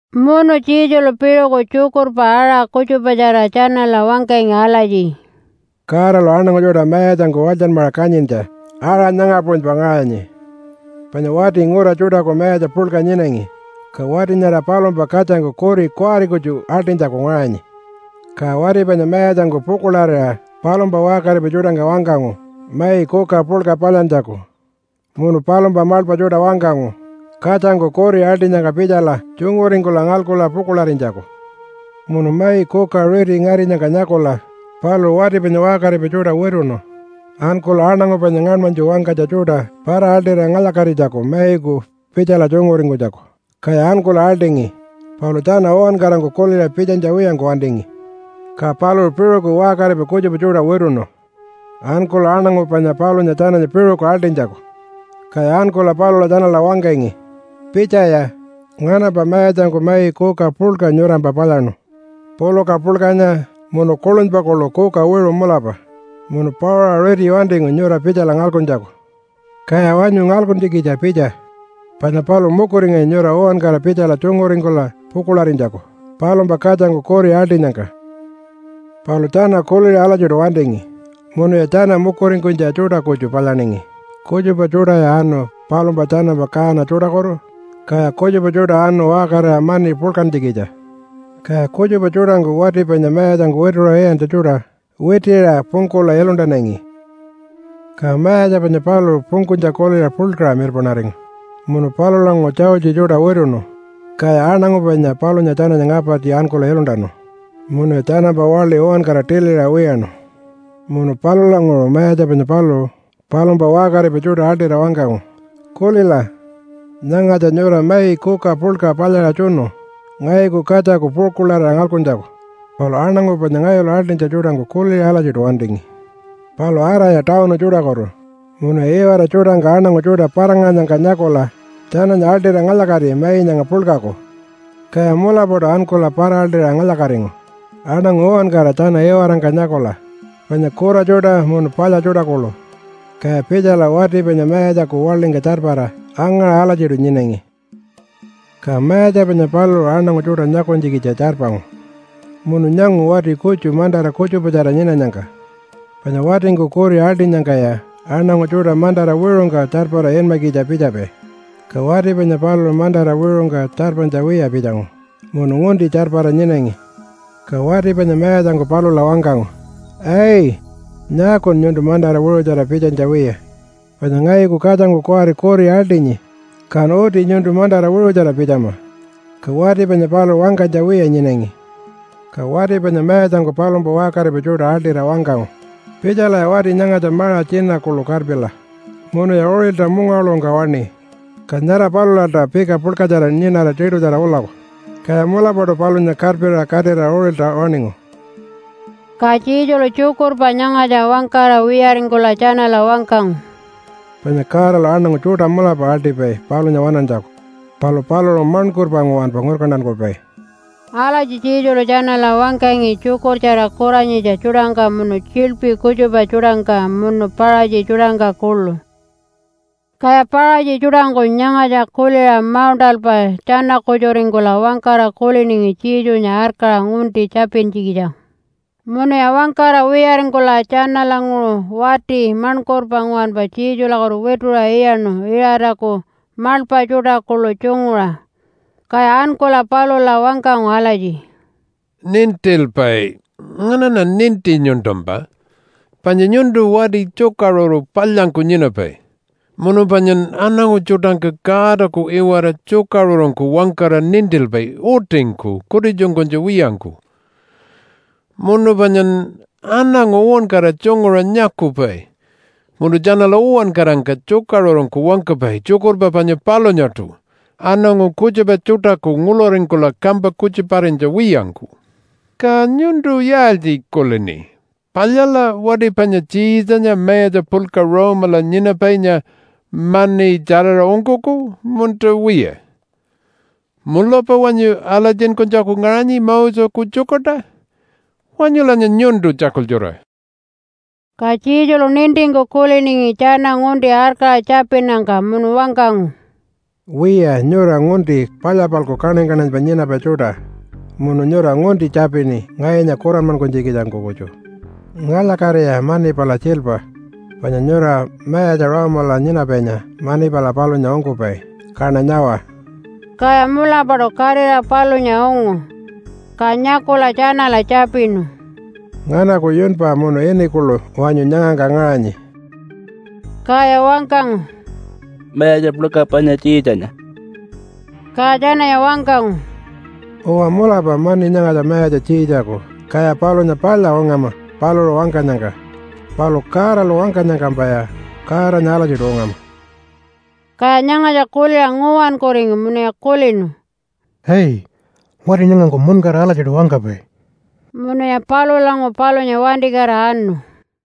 Munu Jesulu piṟuku tjukurpa aṟa kutjupatjara tjanala wangkangi alatji, “Godalu aṉangu tjuṯa mayatjangku walytjanmaṟa kanyintja aṟa nyanga puṟunypa ngaṟanyi panya wati ngura tjuṯaku mayatja puḻka nyinangi ka wati nyara palumpa katjangku kuri kuwari kutju aḻṯinytjaku ngaṟangi. Ka wati panya mayatjangku pukuḻarira palumpa waṟkaripai tjuṯangka wangkangu mai kuka puḻka palyantjaku, munu palumpa maḻpa tjuṯa wangkangu katjangku kuri aḻṯinyangka pitjala tjunguringkula ngalkula pukuḻarinytjaku. Munu mai kuka riti ngarinyangka nyakula paluṟu wati panya waṟkaripai tjuṯa wituṉu ankula aṉangu panya ngaṉmanytju wangkanytja tjuṯa para-aḻṯira ngalya-katinytjaku maiku pitjala tjunguringkunytjaku, kaya ankula aḻṯingi. Palu tjana uwankarangku kuliṟa pitjanytja wiyangku wantingi. Ka paluṟu piṟuku waṟkaripai kutjupa tjuṯa wituṉu ankula aṉangu panya palunya tjananya piṟuku aḻṯinytjaku. Kaya ankula palula tjanala wangkangi, ‘Pitjaya! Nganampa mayatjangku mai kuka puḻka nyurampa palyaṉu puluka puḻkanya munu kuḻunypa kuḻu kuka wiṟu mulapa, munu pauṟa riti wantingu nyura pitjala ngalkuntjaku. Kaya wanyu ngalkuntjikitja pitja, panya paluṟu mukuringanyi nyura uwankara pitjala tjunguringkula pukuḻarinytjaku palumpa katjangku kuri aḻṯinyangka.’ “Palu tjana kuliṟa alatjiṯu wantingi munuya tjana mukuringkunytja tjuṯa kutju palyaningi, kutjupa tjuṯaya anu palumpa tjanampa kaana tjuṯakutu, kaya kutjupa tjuṯa anu waṟkarira mani puḻkantjikitja. Kaya kutjupa tjuṯangku wati panya mayatjangku wituṟa iyantja tjuṯa witiṟa pungkula iluntanangi. “Ka mayatja panya paluṟu pungkunytja kuliṟa puḻkaṟa mirpaṉaringu munu palulanguṟu tjaultji tjuṯa wituṉu, kaya aṉangu panya palunya tjananya ngapartji ankula iluntanu munuya tjanampa waḻi uwankara tiliṟa wiyaṉu. Munu palulanguṟu mayatja panya paluṟu palumpa waṟkaripai tjuṯa aḻṯira wangkangu, ‘Kulila! Nyangatja nyura mai kuka puḻka palyaṟa tjunu ngayuku katjaku pukuḻarira ngalkuntjaku. Palu aṉangu panya ngayulu aḻṯinytja tjuṯangku kuliṟa alatjiṯu wantingi. Palu araya tawunu tjuṯakutu munuya iwara tjuṯangka aṉangu tjuṯa para-ngaṟanyangka nyakula tjananya aḻṯira ngalya-kati mai nyanga puḻkaku.’ Kaya mulapaṯu ankula para-aḻṯira ngalya-katingu aṉangu uwankara tjana iwarangka nyakula panya kura tjuṯa munu palya tjuṯa kuḻu, kaya pitjala wati panya mayatjaku waḻingka tjarpara angaṟa alatjiṯu nyinangi. “Ka mayatja panya paluṟu aṉangu tjuṯa nyakunytjikitja tjarpangu munu nyangu wati kutju mantara kutjupatjara nyinanyangka, panya watingku kuri aḻṯinyangkaya aṉangu tjuṯa mantara wiṟungka tjarpara inmakitja pitjapai. Ka wati panya paluṟu mantara wiṟungka tjarpanytja wiya pitjangu munu ngunti tjarpara nyinangi. Ka wati panya mayatjangku palula wangkangu, ‘Ai! Nyaakun nyuntu mantara wiṟutjara pitjanytja wiya? Panya ngayuku katjangku kuwari kuri aḻṯinyi, kan uti nyuntu mantara wiṟutjara pitjama.’ Ka wati panya paluṟu wangkanytja wiya nyinangi. Ka wati panya mayatjangku palumpa waṟkaripai tjuṯa aḻṯira wangkangu, ‘Pitjalaya wati nyangatja maṟa tjina kuḻu karpila munuya uṟilta mungawaḻuṟungka waṉi, ka nyara palulalta pika puḻkatjara nyinara tiṯutjara ulaku.’ Kaya mulapaṯu palunya karpiṟa katira uṟilta waṉingu.” Ka Jesulu tjukurpa nyangatja wangkara wiyaringkula tjanala wangkangu, “Panya Godalu aṉangu tjuṯa mulapa aḻṯipai palunya waṉantjaku, palu paluṟu maṉkurpa nguwanpa ngurkantankupai.” Alatji Jesulu tjanala wangkangi tjukurtjara kuranyitja tjuṯangka munu tjiḻpi kutjupa tjuṯangka munu Paṟatji tjuṯangka kuḻu. Kaya Paṟatji tjuṯangku nyangatja kuliṟa mauṉṯalpa tjana-kutjuringkula wangkara kuliningi Jesunya arkaṟa ngunti tjapintjikitjangku. Munuya wangkara wiyaringkula tjanalanguṟu wati maṉkurpa nguwanpa Jesulakutu wituṟa iyaṉu Iṟataku maḻpa tjuṯa kuḻu tjunguṟa. Kaya ankula palula wangkangu alatji, “Nintilpai! Nganaṉa ninti nyuntumpa, panya nyuntu wati tjukaṟuru palyanyku nyinapai. Munu panyan aṉangu tjuṯangka Godaku iwara tjukaṟurungku wangkara nintilpai utingku kutitjunkunytja wiyangku. Munu panyan aṉangu uwankara tjunguṟa nyakupai munu tjanala uwankarangka tjukaṟurungku wangkapai tjukurpa panya palunyaṯu aṉangu kutjupa tjuṯaku nguḻuringkula kampa kutjuparinytja wiyangku. Ka nyuntu yaaltji kulini? Palyala wati panya Tjiitjanya mayatja puḻka Rome-ala nyinapainya mani tjaraṟa ungkuku, munta wiya? Mulapa wanyu alatjinkunytjaku ngaṟanyi Moseku tjukurta? Wanyulanya nyuntu tjakultjura!” Ka Jesulu nintingku kuliningi tjana ngunti arkaṟa tjapinnyangka munu wangkangu, “Wiya, nyura ngunti palya-palku kaṉany-kaṉanypa nyinapai tjuṯa munu nyura ngunti tjapini ngayunya kuranmankunytjikitjangku kutju. Ngalya-katiya mani pala tjiilpa panya nyura mayatja Rome-ala nyinapainya mani pala palunya ungkupai, kaṉa nyawa!” Kaya mulapaṯu katira palunya ungu. Ka nyakula tjanala tjapinu, “Nganaku yunpa munu ini kuḻu wanyu nyangangka ngaṟanyi?” Kaya wangkangu, “Mayatja puḻka panya Tjiitjanya.” Ka tjananya wangkangu, “Uwa mulapa mani nyangatja mayatja Tjiitjaku, kaya palunya palya ungama paluṟu wangkanyangka, palu Godalu wangkanyangkampaya Godanya alatjiṯu ungama.” Kaya nyangatja kuliṟa nguwankuringu munuya kulinu, “Ai, wati nyangangku muṉkara alatjiṯu wangkapai.” Munuya palulanguṟu palunya wantikatira anu.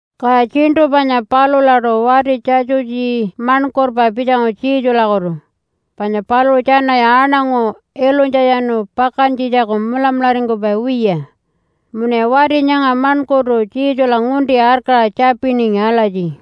Kaya tjiṉṯu panya palulaṯu wati Tjatjutji maṉkurpa pitjangu Jesulakutu, panya paluṟu tjanaya aṉangu ilunytjatjanu pakantjitjaku mulamularingkupai wiya. Munuya wati nyanga maṉkurtu Jesula ngunti arkaṟa tjapiningi alatji,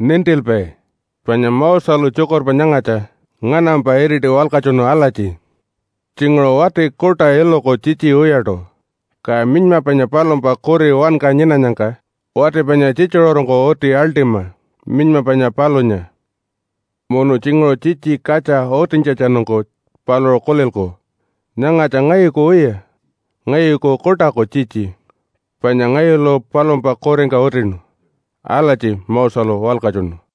“Nintilpai, panya Moselu tjukurpa nyangatja nganampa iriti walkatjunu alatji, ‘Tjinguṟu wati kuṯa iluku tjitji wiyaṯu, ka minyma panya palumpa kuri wanka nyinanyangka wati panya tjitjuṟurungku uti aḻṯima minyma panya palunya. Munu tjinguṟu tjitji katja utintjatjanungku paluṟu kulilku, “Nyangatja ngayuku wiya, ngayuku kuṯaku tjitji, panya ngayulu palumpa kuringka utinu.” ’ Alatji Moselu walkatjunu.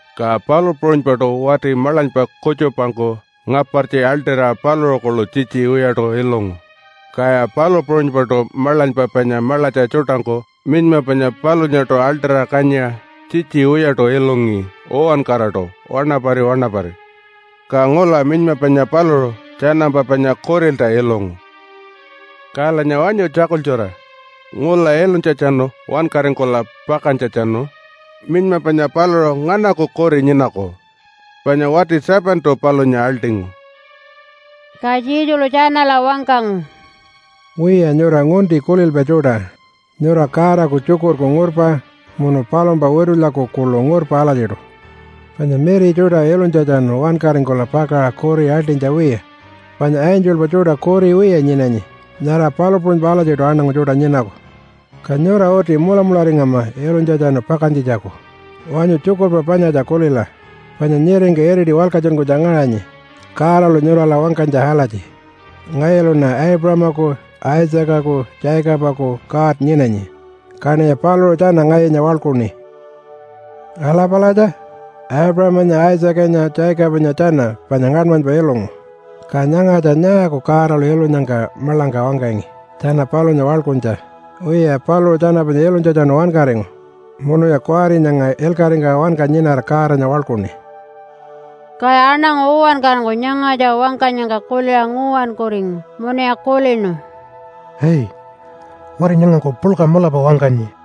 ka palu puṟunypaṯu wati maḻanypa kutjupangku ngapartji aḻṯira paluṟu kuḻu tjitji wiyaṯu ilungu. Kaya palu puṟunypaṯu maḻanypa panya maḻatja tjuṯangku minyma panya palunyaṯu aḻṯira kanyiṟa tjitji wiyaṯu ilungi uwankaraṯu wanapari wanapari. Ka ngula minyma panya paluṟu tjanampa panya kurilta ilungu. “Kalanya wanyu tjakultjura! Ngula ilunytjatjanu wankaringkula pakantjatjanu minyma panya paluṟu nganaku kuri nyinaku? Panya wati 7-tu palunya aḻṯingu.” Ka Jesulu tjanala wangkangu, “Wiya, nyura ngunti kulilpai tjuṯa. Nyura Godaku tjukurku ngurpa munu palumpa witulyaku kuḻu ngurpa alatjiṯu. Panya miri tjuṯa ilunytjatjanu wankaringkula pakaṟa kuri aḻṯinytja wiya, panya angelpa tjuṯa kuri wiya nyinanyi, nyara palu puṟunypa alatjiṯu aṉangu tjuṯa nyinaku. Ka nyura uti mulamularingama ilunytjatjanu pakantjitjaku. Wanyu tjukurpa panyatja kulila, panya nyiringka iriti walkatjunkunytja ngaṟanyi Godalu nyurala wangkanytja alatji, ‘Ngayuluṉa Aipuṟamaku, Isaacaku, Jacobaku God nyinanyi, kaṉiya paluṟu tjana ngayunya waḻkuṉi.’ Ala palatja. Aipuṟamanya, Isaacanya, Jacobanya tjana panya ngaṉmanypa ilungu, ka nyangatja nyaaku Godalu ilunyangka maḻangka wangkangi tjana palunya waḻkuntja? Wiya, paluṟu tjana panya ilunytjatjanu wankaringu munuya kuwari nyanga ilkaṟingka wanka nyinara Godanya waḻkuṉi.” Kaya aṉangu uwankarangku nyangatja wangkanyangka kuliṟa nguwankuringu munuya kulinu, “Ai, wati nyangangku puḻka mulapa wangkanyi.”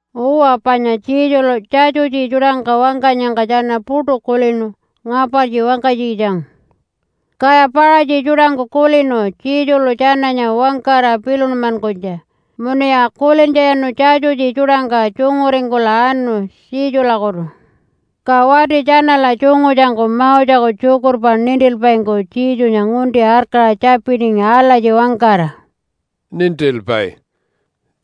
Uwa, panya Jesulu Tjatjutji tjuṯangka wangkanyangka tjana puṯu kulinu ngapartji wangkanytjikitjangku. Kaya Paṟatji tjuṯangku kulinu Jesulu tjananya wangkara pilunmankunytja, munuya kulintjatjanu Tjatjutji tjuṯangka tjunguringkula anu Jesulakutu. Ka wati tjanala tjungutjangku Moseku tjukurpa nintilpaingku Jesunya ngunti arkaṟa tjapiningi alatji wangkara, “Nintilpai!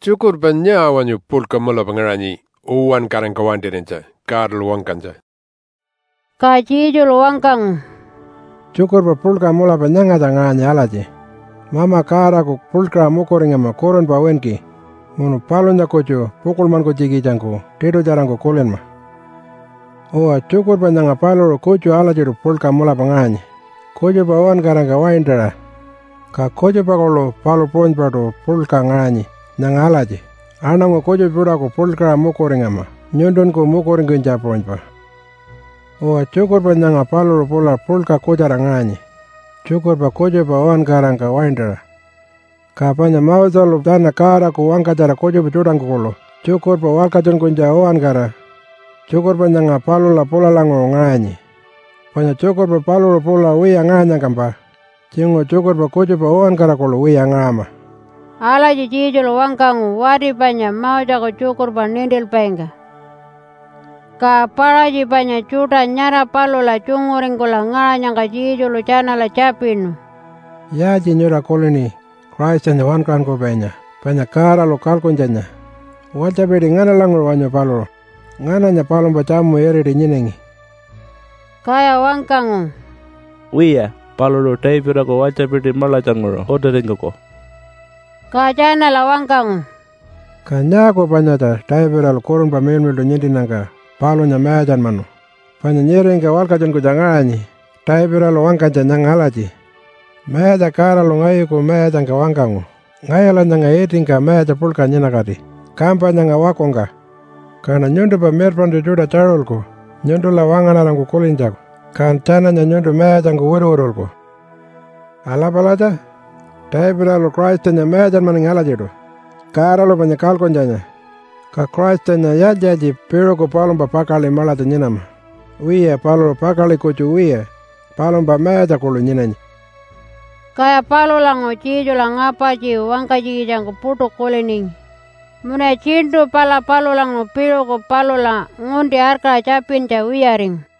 Tjukurpa nyaa wanyu puḻka mulapa ngaṟanyi uwankarangka waintarinytja Godalu wangkanytja?” Ka Jesulu wangkangu, “Tjukurpa puḻka mulapa nyangatja ngaṟanyi alatji, ‘Mama Godaku puḻkaṟa mukuringama kurunpa winki, munu palunya kutju pukuḻmankunytjikitjangku tiṯutjarangku kulinma.’ Uwa, tjukurpa nyanga paluṟu kutju alatjiṯu puḻka mulapa ngaṟanyi kutjupa uwankarangka waintaṟa. Ka kutjupa kuḻu palu puṟunypaṯu puḻka ngaṟanyi nyanga alatji, ‘Aṉangu kutjupa tjuṯaku puḻkaṟa mukuringama nyuntunku mukuringkunytja puṟunypa.’ Uwa, tjukurpa nyanga paluṟu pula puḻka kutjara ngaṟanyi tjukurpa kutjupa uwankarangka waintaṟa. Ka panya Moselu tjana Godaku wangkatjara kutjupa tjuṯangku kuḻu tjukurpa walkatjunkunytja uwankara tjukurpa nyanga palula pulalanguṟu ngaṟanyi. Panya tjukurpa paluṟu pula wiya ngaṟanyangkampa tjinguṟu tjukurpa kutjupa uwankara kuḻu wiya ngaṟama.” Alatji Jesulu wangkangu wati panya Moseku tjukurpa nintilpaingka. Ka Paṟatji panya tjuṯa nyara palula tjunguringkula ngaṟanyangka Jesulu tjanala tjapinu, “Yaaltji nyura kulini Christanya Wankaṟunkupainya panya Godalu kalkuntjanya? Walytjapiti nganalanguṟu wanyu paluṟu? Ngananya palumpa tjamu iriti nyinangi?” Kaya wangkangu, “Wiya, paluṟu Davidaku walytjapiti maḻatjanguṟu utiringkuku.” Ka tjanala wangkangu, “Ka nyaaku panyatja Davidalu Kurunpa Miḻmiḻṯu nintinnyangka palunya mayatjanmanu? Panya nyiringka walkatjunkunytja ngaṟanyi Davidalu wangkanytja nyanga alatji, ‘Mayatja Godalu ngayuku Mayatjangka wangkangu, “Ngayula nyanga itingka mayatja puḻka nyinakati kampa nyanga wakungka. Kaṉa nyuntumpa mirpaṉtju tjuṯa tjaṟulku nyuntula wangaṉarangku kulintjaku, kan tjananya nyuntu mayatjangku wituwitulku.” ’ Ala palatja! Davidalu Christanya mayatjanmanangi alatjiṯu Godalu panya kalkuntjanya, ka Christanya yaaltji-yaaltji piṟuku palumpa pakaḻi maḻatja nyinama? Wiya, paluṟu pakaḻi kutju wiya palumpa mayatja kuḻu nyinanyi.” Kaya palulanguṟu Jesula ngapartji wangkanytjikitjangku puṯu kuliningi, munuya tjiṉṯu pala palulanguṟu piṟuku palula ngunti arkaṟa tjapintja wiyaringu.